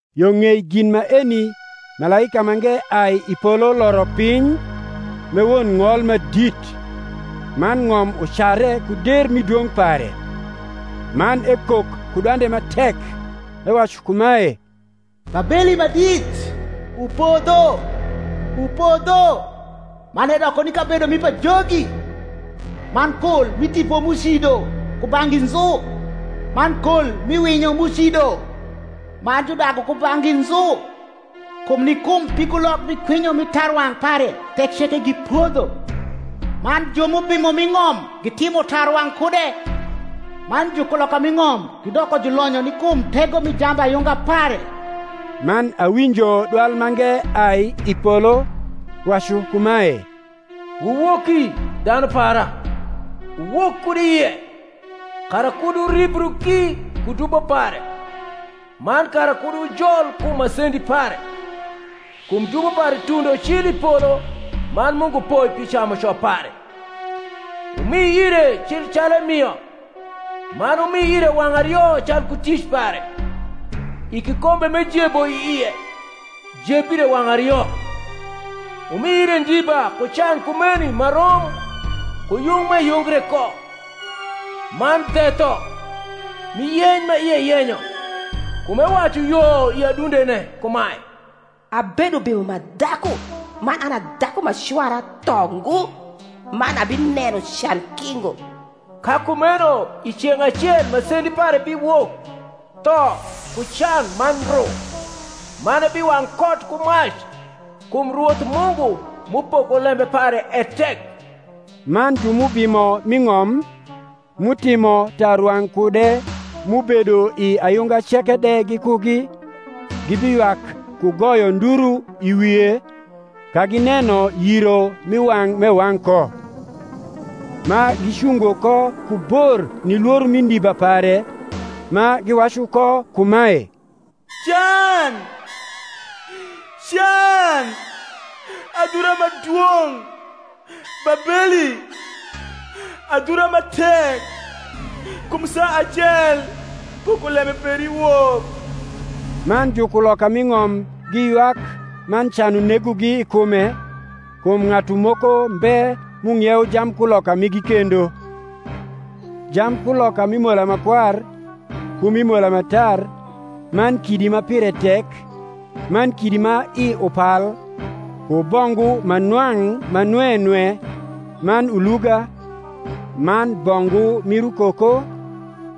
Yo ng’ei gin maeni malaika mange ai i polo loro piny, m’e won ng’ol ma dit; man ng’om ucare ku der mi dwong’ pare. Man ekok ku dwande ma tek, ewacu kumae, Babeli ma dit, upodho, upodho, man edoko ni kabedo mi pajogi, man kol mi tipo m’ucido kubang’gi nzu, man kol mi winyo m’ucido ma judagu kubang’gi nzu. Kum ni kum pigulok mi kwinyo mi tarwang’ pare thek ceke gipodho; man ju m’ubimo m’i ng’om gitimo tarwang’ kude, man jukuloka m’i ng’om gidoko julonyo ni kum tego mi jambayunga pare. Man awinjo dwal mange ai i polo, wacu kumae, Wuwoki, dhanu para, wuwok kud i ie, kara kud wuribru ki ku dubo pare, man kara kud wujol kum masendi pare: kum dubo pare tundo cil i polo, man Mungu poi pi camuco pare. Wumi ire cil calu emio, man wumi ire wang’ ario calku tic pare: i kikombe m’ejebo i ie, jeb ire wang’ ario. Wumi ire ndiba ku can kumeni ma rom ku yung m’eyungre ko, man dhetho mi yeny ma ie yenyo: kum ewacu yo i adundene kumae, Abedo ubimo ma dhaku, man an a dhaku ma cwara tho ngo, man abineno can ki ngo. Ka kumeno i ceng’ acel masendi pare biwok, tho, ku can, man ndru; man ebiwang’ kot ku mac; kum Rwoth Mungu m’upoko lembe pare e tek. Man ju m’ubimo m’i ng’om, m’utimo tarwang’ kude m’ubedo i ayunga ceke de gikugi, gibiywak ku goyo nduru i wie, ka gineno yiro mi wang’ m’ewang’ ko,’ ma gicungo ko ku bor ni lworo mi ndiba pare, ma giwacu ko kumae, Can, can, adhura ma dwong’, Babeli, adhura ma tek! kum i saa acel pokolembe peri wok. Man jukuloka m’i ng’om giywak man can unegogi i kume, kum ng’atu moko mbe m’ung’iewo jambkuloka migi kendo; jambkuloka mi mola ma kwar, ku mi mola ma tar, man kidi ma pire tek, man kidi ma i upal, ku bongu ma nwang’ ma nwe nwe, man uluga, man bongu mir ukoko,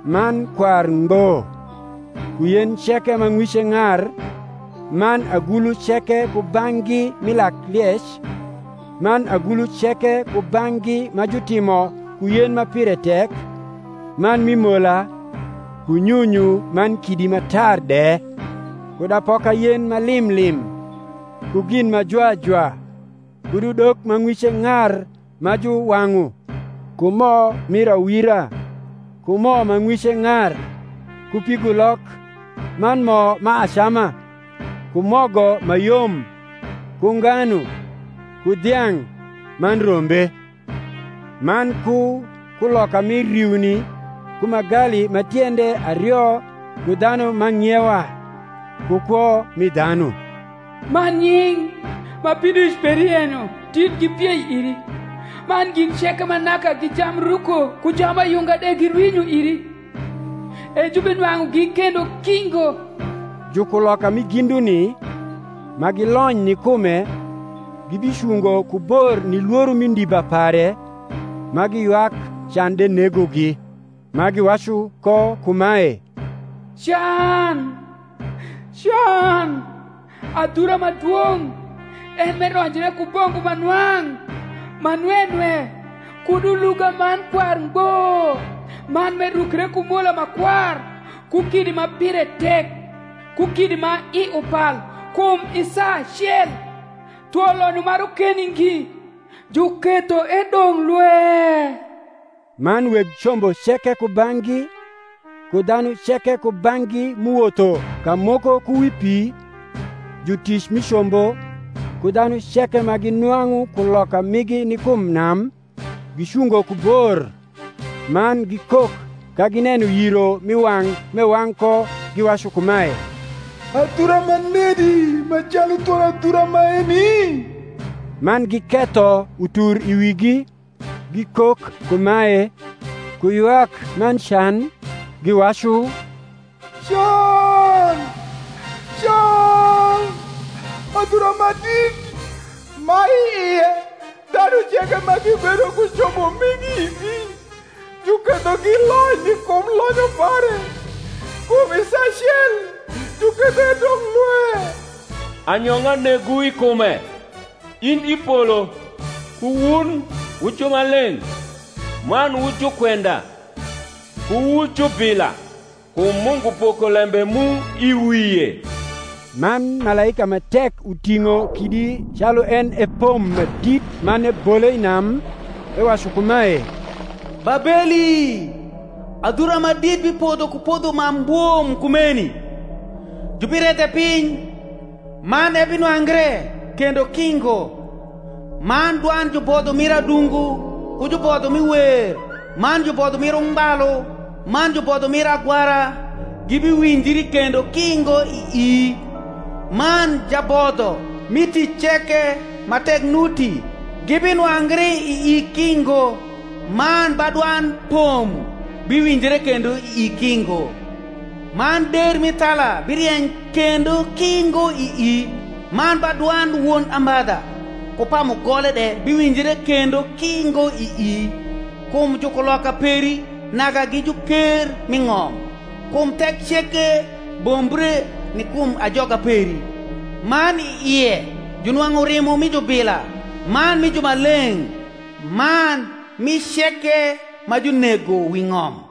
man kwar ngbo; ku yen ceke ma ng’wice ng’ar, man agulu ceke kubang’gi mi lakliec, man agulu ceke kubang’gi ma jutimo ku yen ma pire tek, man mi mola, ku nyunyu man kidi ma tar de; kud apoka yen ma lim lim, ku gin ma jwa jwa, kud udok ma ng’wice ng’ar ma juwang’u, ku mo mir awira, ku mo ma ng’wice ng’ar, ku pigulok, man mo ma acama, ku mogo ma yom, ku nganu, ku dhiang’, man rombe; man ku kuloka mi riuni ku magali ma tiende ario ku dhanu ma ang’ iewa; ku kwo mi dhanu. Man nying’ ma pidoic peri yenyo dit gipiei iri, man gin ceke ma naka gi jambruko ku jambayunga de girwinyo iri, e jubinwang’ugi kendo ki ngo. Jukuloka mi ginduni, ma gilony ni kume, gibicungo ku bor ni lworo mi ndiba pare, ma giywak can de negogi; ma giwacu ko kumae, Can, can, adhura ma dwong’, en m’eronjre ku bongu ma nwang’ ma nwe nwe kud uluga man kwar ngbo, man m’erukre ku mola ma kwar ku kidi ma pire tek ku kidi ma i upal! kum i saa acel thwo lonyo ma rokeni ngi juketho edong’ lwe. Man weg combo ceke kubang’gi, ku dhanu ceke kubang’gi m’uwotho ka moko ku wi pi, ku jutic mi combo, ku dhanu ceke ma ginwang’u kuloka migi ni kum nam, gicungo ku bor, man gikok ka gineno yiro mi wang’ m’ewang’ ko, giwacu kumae, Adhura ma nedi ma calu thwon adhura maeni? Man giketho utur i wigi, gikok kumae, ku ywak man can, giwacu, Can, can, adhura ma dit, ma i ie dhanu ceke ma gibedo ku combo migi i pi juketho gilony ni kum lonyo pare! kum i saa acel juketho edong’ lwe. Anyong’a negwu i kume, in i polo, ku wun wu jumaleng’, man wu jukwenda, ku wu jubila; kum Mungu poko lembe mu i wie. Man malaika ma tek uting’o kidi calu en e pom ma dit man ebole i nam, ewacu kumae, Babeli, adhura ma dit bipodho ku podho ma mbwom kumeni, jubiredhe piny, man ebinwangre kendo ki ngo. Man dwand jubodlio mir adungu ku jubodho mi wer man jubodho mir ungbalu man jubodho mir agwara gibiwinjri kendo ki ngo ii; man jabodho, mi tic ceke ma tek nuti, gibinwangri ii ki ngo; man ba dwand pom biwinjre kendo ii ki ngo; man der mi thala birieny kendo ki ngo ii; man ba dwand won ambadha ku pa mugole de biwinjre kendo ki ngo ii; kum jukuloka peri naka gi juker m’i ng’om; kum thek ceke bombre ni kum ajoga peri. Man i ie junwang’u rimo mi jubila man mi jumaleng’, man mi ceke ma junego wi ng’om.